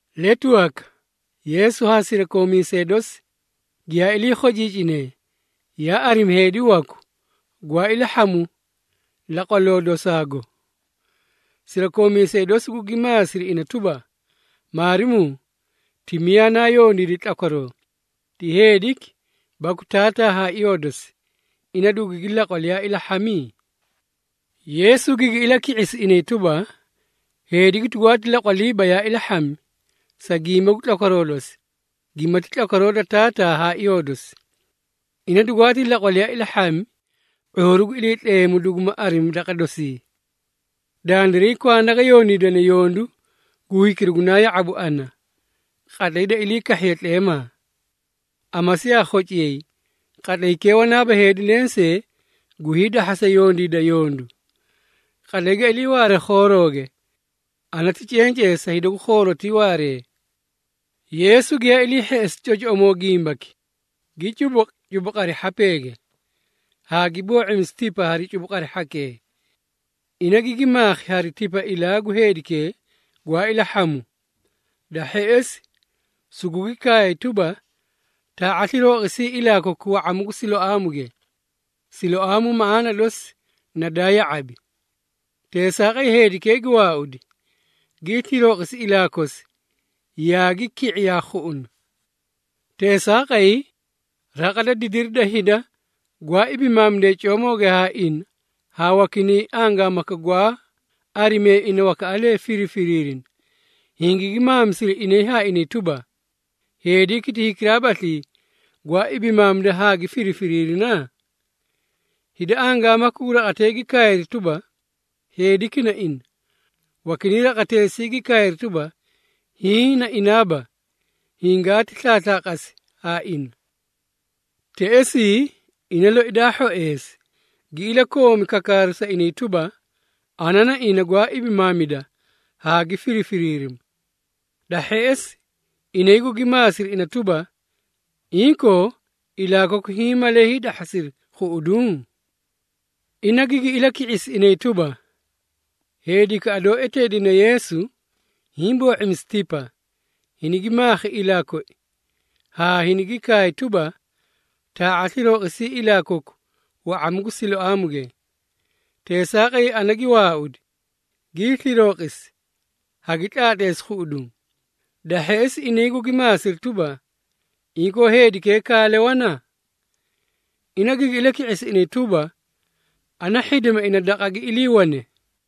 Letu waka, Yeesu haa sirakoomiisee dosi, giyaa ilii khociicinee, yaa arimi heedi waku gwaa ilahhamu laqwaloo dosaago. Sirakoomiisee dosi gugi maasiri ina tuba, “Maarimuu, ti miyaa naa yondiidi tlakwaroo, ti heediki baku taataa haa iyoo dosi, ina dugugi laqwali yaa ilahhami?” Yeesu gigi ilaki⁄isi inay tuba, “Heediki dugwaati laqwaliiba yaa ilahhami, sa gimba gu tlakwaroo dosi, gimati tlakwaroo da taataa haa iyoo dosi. Ina dugwaati laqwali yaa ilahhami, ⁄uuru gu Iliitleemu duguma arimi daqa dosii. Dandiray kwanda ga yondiidane yondu gu hikira gunaa ya⁄abu ana, qatlay da ilii kahhiye tleemaa. Amasi yaa khociyay, qatlaykee wanaaba heedi lensee gu hiidahhasa yondiida yondu. Qatlay ga iliiwaare khoorooge, ana ti cencee sa hida gu khoorotii waaree.” Yeesu giyaa ilii hheꞌesi cocoꞌomoo gimbaki, gi cubuqi cubuqari hhapeege, haa gi boo⁄imisi tipa hari cubuqari hhakee. Ina gigi maakhi hari tipa ilaa gu heedikee gwaa ilahhamu. Da hheꞌesi, sugugi kaay tuba, “Taa⁄a slirooqisii ilaa koku wa⁄amu gu Siloaamuge.” (Siloaamu maꞌaana dosi na daa ya⁄abi.) Teesaaqay heedikee gi waaudi, gii slirooqisi ilaa kosi, yaagi ki⁄i yaa khuꞌuna. Teesaaqay, raqa da didiri da hida gwaa ibimaamidee coomooge haa ina haa wakinay angaamaka gwaa arimee ina wakaꞌalee firifiriirina, hingigi maamisiri inay haa inay tuba, “Heediki ti hikiraabaslii gwaa ibimaamida haa gi firifiriirina?” Hida angaamaka gu raqatee gi kaayri tuba, “Heediki na ina.” Wakinay raqateesii gi kaayri tuba, “Hiĩ na inaaba, hingaati slaaslaaqasi haa ina.” Teꞌesii ina loi daa hhoeesi, gi ilakoomi kakaaru sa inay tuba, “Ana na ina gwaa ibimaamida haa gi firifiriirima.” Da hheꞌesi, inay gugi maasiri ina tuba, “Inkoo, ilaa koku hiĩ malee hiidahhasiri khuꞌuduũ?” Ina gigi ilaki⁄isi inay tuba, “Heedikaꞌa doó eteedine Yeesu hiĩ boo⁄imisi tipa, hinigi maakhi ilaa koi, haa hinigi kaay tuba, ‘Taa⁄a slirooqisii ilaa koku wa⁄amu gu Siloaamuge.’ Teesaaqay ana gi waaudi, gii slirooqisi, hagi tlaatleesi khuꞌuduũ.” Da hheꞌesi, inay gugi maasiri tuba, “Inkoo heedikee kaale wana?” Ina gigi ilaki⁄isi inay tuba, “Ana hhidima ina daqa gi iliiwane.”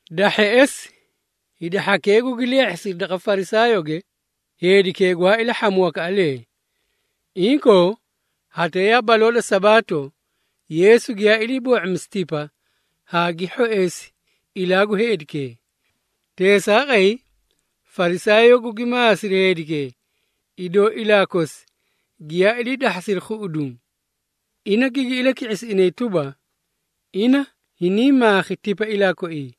Da hheꞌesi, hida hhakee gugi leehhisiri daqa Farisaayooge heedikee gwaa ilahhamu wakaꞌalee. Inkoo, hatee yaa baloo da Sabaato, Yeesu giyaa ilii boo⁄imisi tipa haa gi hhoeesi ilaa gu heedikee. Teesaaqay, Farisaayoo gugi maasiri heedikee, idoo ilaa kosi giyaa ilii dahhasiri khuꞌuduũ. Ina gigi ilaki⁄isi inay tuba, “Ina hiniĩ maakhi tipa ilaa koii,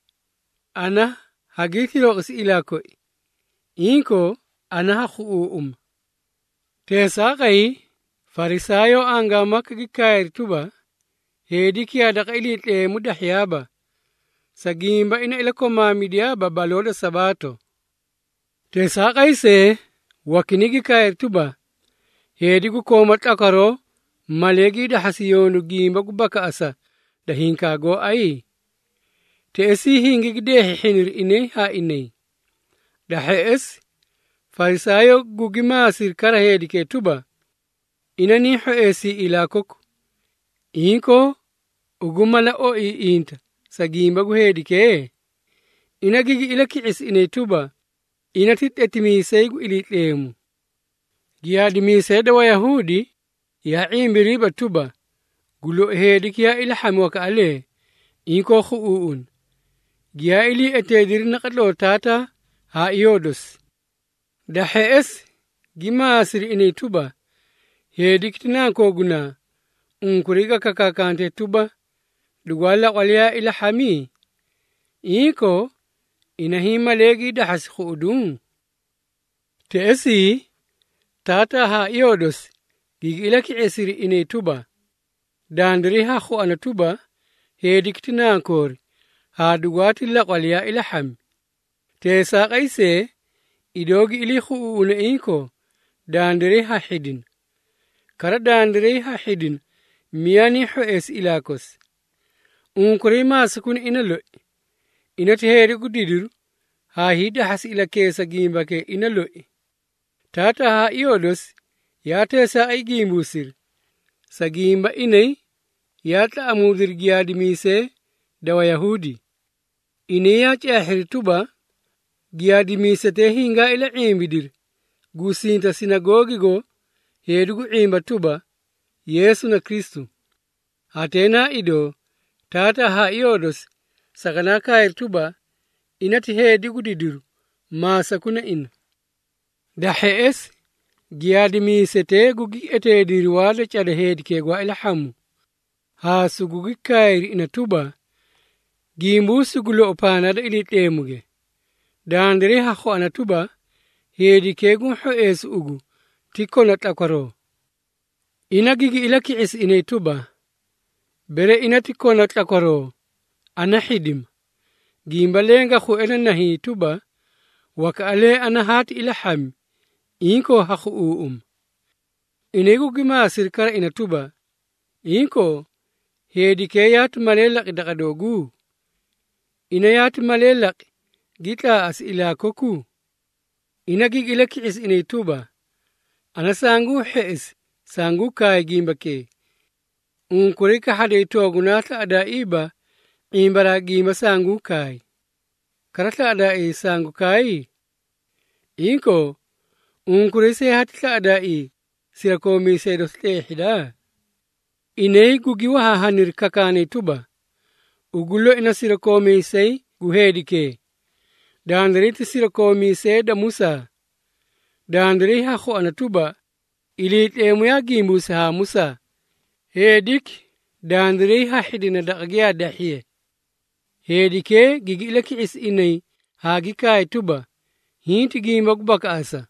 ana hagii slirooqisi ilaa koi, inkoo ana ha khuꞌuuꞌuma.” Teesaaqay, Farisaayoo angaamaka gi kaayri tuba, “Heediki yaa daqa Iliitleemu dahhiyaaba, sa gimba ina iliikomaamidiyaaba baloo da Sabaato.” Teesaaqay see, wakinay gi kaayri tuba, “Heedi gu kooma tlakwaroo malee gii dahhasi yondu gimba gu bakaꞌasa da hinkaa gooay?” Teꞌesii, hingigi deehhiihhiniri inay haa inay. Da hheꞌesi, Farisaayoo gugi maasiri kara heedikee tuba, “Ina niĩ hhoeesii ilaa koku. Inkoo, ugu mala oiiꞌinta sa gimba gu heedikee?” Ina gigi ilaki⁄isi inay tuba, “Ina ti tletimiisay gu Iliitleemu.” Giyaadimiisee da Wayahuudi yaa ⁄imbiriiba tuba, gu lou heediki yaa ilahhami wakaꞌalee, inkoo khuꞌuuꞌuna, giyaa iliieteediri naqatloo taataa haa iyoo dosi. Da hheꞌesi, gi maasiri inay tuba, “Heediki ti nakooguna, unkuray ga kakaakantee tuba, dugwaa laqwali yaa ilahhami? Inkoo, ina hiĩ malee gii dahhasi khuꞌuduũ?” Teꞌesii, Taataa haa iyoo dosi gigi ilaki⁄isiri inay tuba, “Dandiray ha khuana tuba, heediki ti nankoori haa dugwaati laqwali yaa ilahhami. Teesaaqay see, idoo gi ilii khuꞌuuꞌune inkoo, dandiray ha hhidina. Kara dandiray ha hhidina miyaa niĩ hhoeesi ilaa kosi. Unkuray maasakuna ina loi. Ina ti heedi gu didiru haa hiidahhasi ilakeesa gimbakee ina loi.” Taataa haa iyoo dosi yaa teesaaqay gimbuusiri, sa gimba inay yaa tlaꞌamuudiri giyaadimiisee da Wayahuudi. Inay yaa caahhiri tuba, giyaadimiisetee hingaa ila⁄imbidiri gusinta sinagoogigo heedi gu ⁄imba tuba, Yeesu na Kristu. Hatee na idoo, taataa haa iyoo dosi saganaa kaayri tuba, “Ina ti heedi gu didiru, maasakuna ina.” Da hheꞌesi, giyaadimiisetee gugi eteediri waa da cada heedikee gwaa ilahhamu, haa sugugi kaayri ina tuba, “Gimbuusi gu lou pandaa da Iliitleemuge! Dandiray ha khuana tuba, heedikee guũ hhoeesu ugu ti kona tlakwaroo.” Ina gigi ilaki⁄isi inay tuba, “Bere ina ti kona tlakwaroo, ana hhidima. Gimba leẽ ga khue na nahiĩ tuba, wakaꞌalee ana haati ilahhami, inkoo ha khuꞌuuꞌuma.” Inay gugi maasiri kara ina tuba, “Inkoo, heedikee yaati malee laqi daqa dooguu? Ina yaati malee laqi gi tlaaꞌasi ilaa koku?” Ina gigi ilaki⁄isi inay tuba, “Ana sanguu hheꞌesi sanguu kaay gimbakee, unkuray kahhaday toogunaa slaꞌadaaiiba ⁄imbaraa gimba sanguũ kaay. Kara slaꞌadaaii sangu kaay? Inkoo, unkuray see hati slaꞌadaaii sirakoomiisee dosi tleehhida?” Inay gugi wahaahaniri kakaanay tuba, “Ugu loi na sirakoomiisay gu heedikee! Dandiray ti sirakoomiisee da Musaa! Dandiray ha khuana tuba, Iliitleemu yaa gimbuusi haa Musaa. Heediki, dandiray ha hhidina daqa giyaa dahhiye!” Heedikee gigi ilaki⁄isi inay haa gi kaay tuba, “Hiĩ ti gimba gu bakaꞌasa!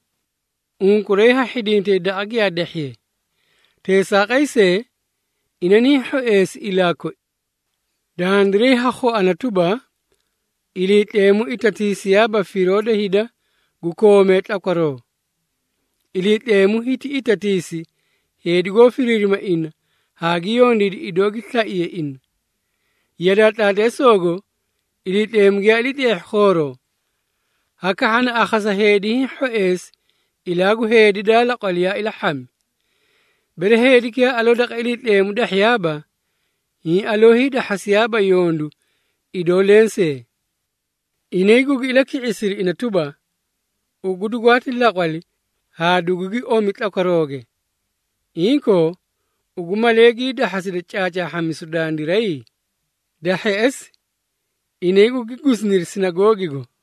Unkuray ha hhidintay daqa giyaa dahhiye. Teesaaqay see, ina niĩ hhoeesi ilaa koi! Dandiray ha khuana tuba, Iliitleemu itatiisiyaaba firoo da hida gu koomee tlakwaroo. Iliitleemu hiti itatiisi heedi goó firiirima ina haa gi yondiidi idoo gi slaiye ina. Yadaa tlaatleesoogo Iliitleemu giyaa ilii tleehhi khooroo, hakahhana akhasa heedi hiĩ hhoeesi ilaa gu heedi daa laqwali yaa ilahhamu. Bere heediki yaa aloo daqa Iliitleemu dahhiyaaba, hiĩ aloo hiidahhasiyaaba yondu idoo lensee.” Inay gugi ilaki⁄isiri ina tuba, “Ugu dugwaati laqwali haa dugugi omi tlakwarooge. Inkoo, ugu malee gii dahhasida caacaahhamisu dandiray?” Da hheꞌesi, inay gugi gusiniri Sinagoogigo.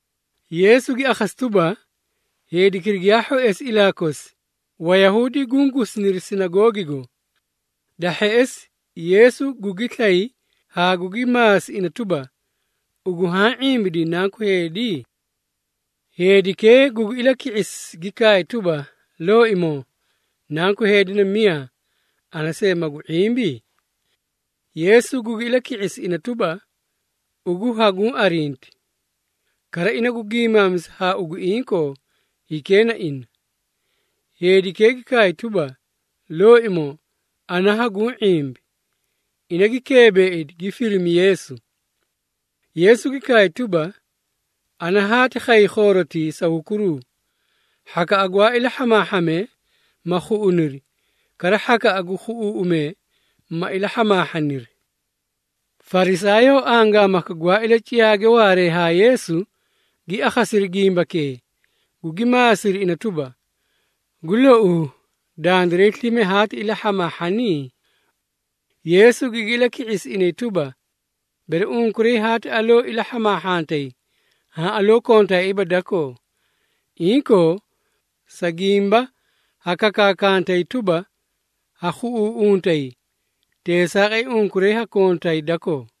Yeesu gi akhasi tuba, heedikira giyaa hhoeesi ilaa kosi, Wayahuudi guũ gusiniri sinagoogigo. Da hheꞌesi, Yeesu gugi slay haa gugi maasi ina tuba, “Ugu haã ⁄imbidii Nanku Heedi?” Heedikee gugi ilaki⁄isi gi kaay tuba, “Looimoo, Nanku Heedi na miyaa, ana see magu ⁄imbi?” Yeesu gugi ilaki⁄isi ina tuba, “Ugu haguũ arinti. Kara ina gu giimaamisa haa ugu inkoo, hikee na ina.” Heedikee gi kaay tuba, “Looimoo, ana haguũ ⁄imbi.” Ina gi keebeeidi gi firimi Yeesu. Yeesu gi kaay tuba, “Ana haati khay khoorotii sa hukuru, hhakaꞌa gwaa ilahhamaahhamee ma khuꞌuniri, kara hhakaꞌa gu khuꞌuuꞌumee, ma ilahhamaahhaniri.” Farisaayoo angaamaka gwaa ilaciyaage waaree haa Yeesu gi akhasiri gimbakee, gugi maasiri ina tuba, “Gu louu, dandiray slime haati ilahhamaahhanii?” Yeesu gigi ilaki⁄isi inay tuba, “Bere unkuray haati aloo ilahhamaahhantay, haã aloo kontaaiiba dakoo. Inkoo, sa gimba ha kakaakantay tuba, ‘Ha khuꞌuuꞌuntay,’ teesaaqay unkuray ha kontay dakoo.”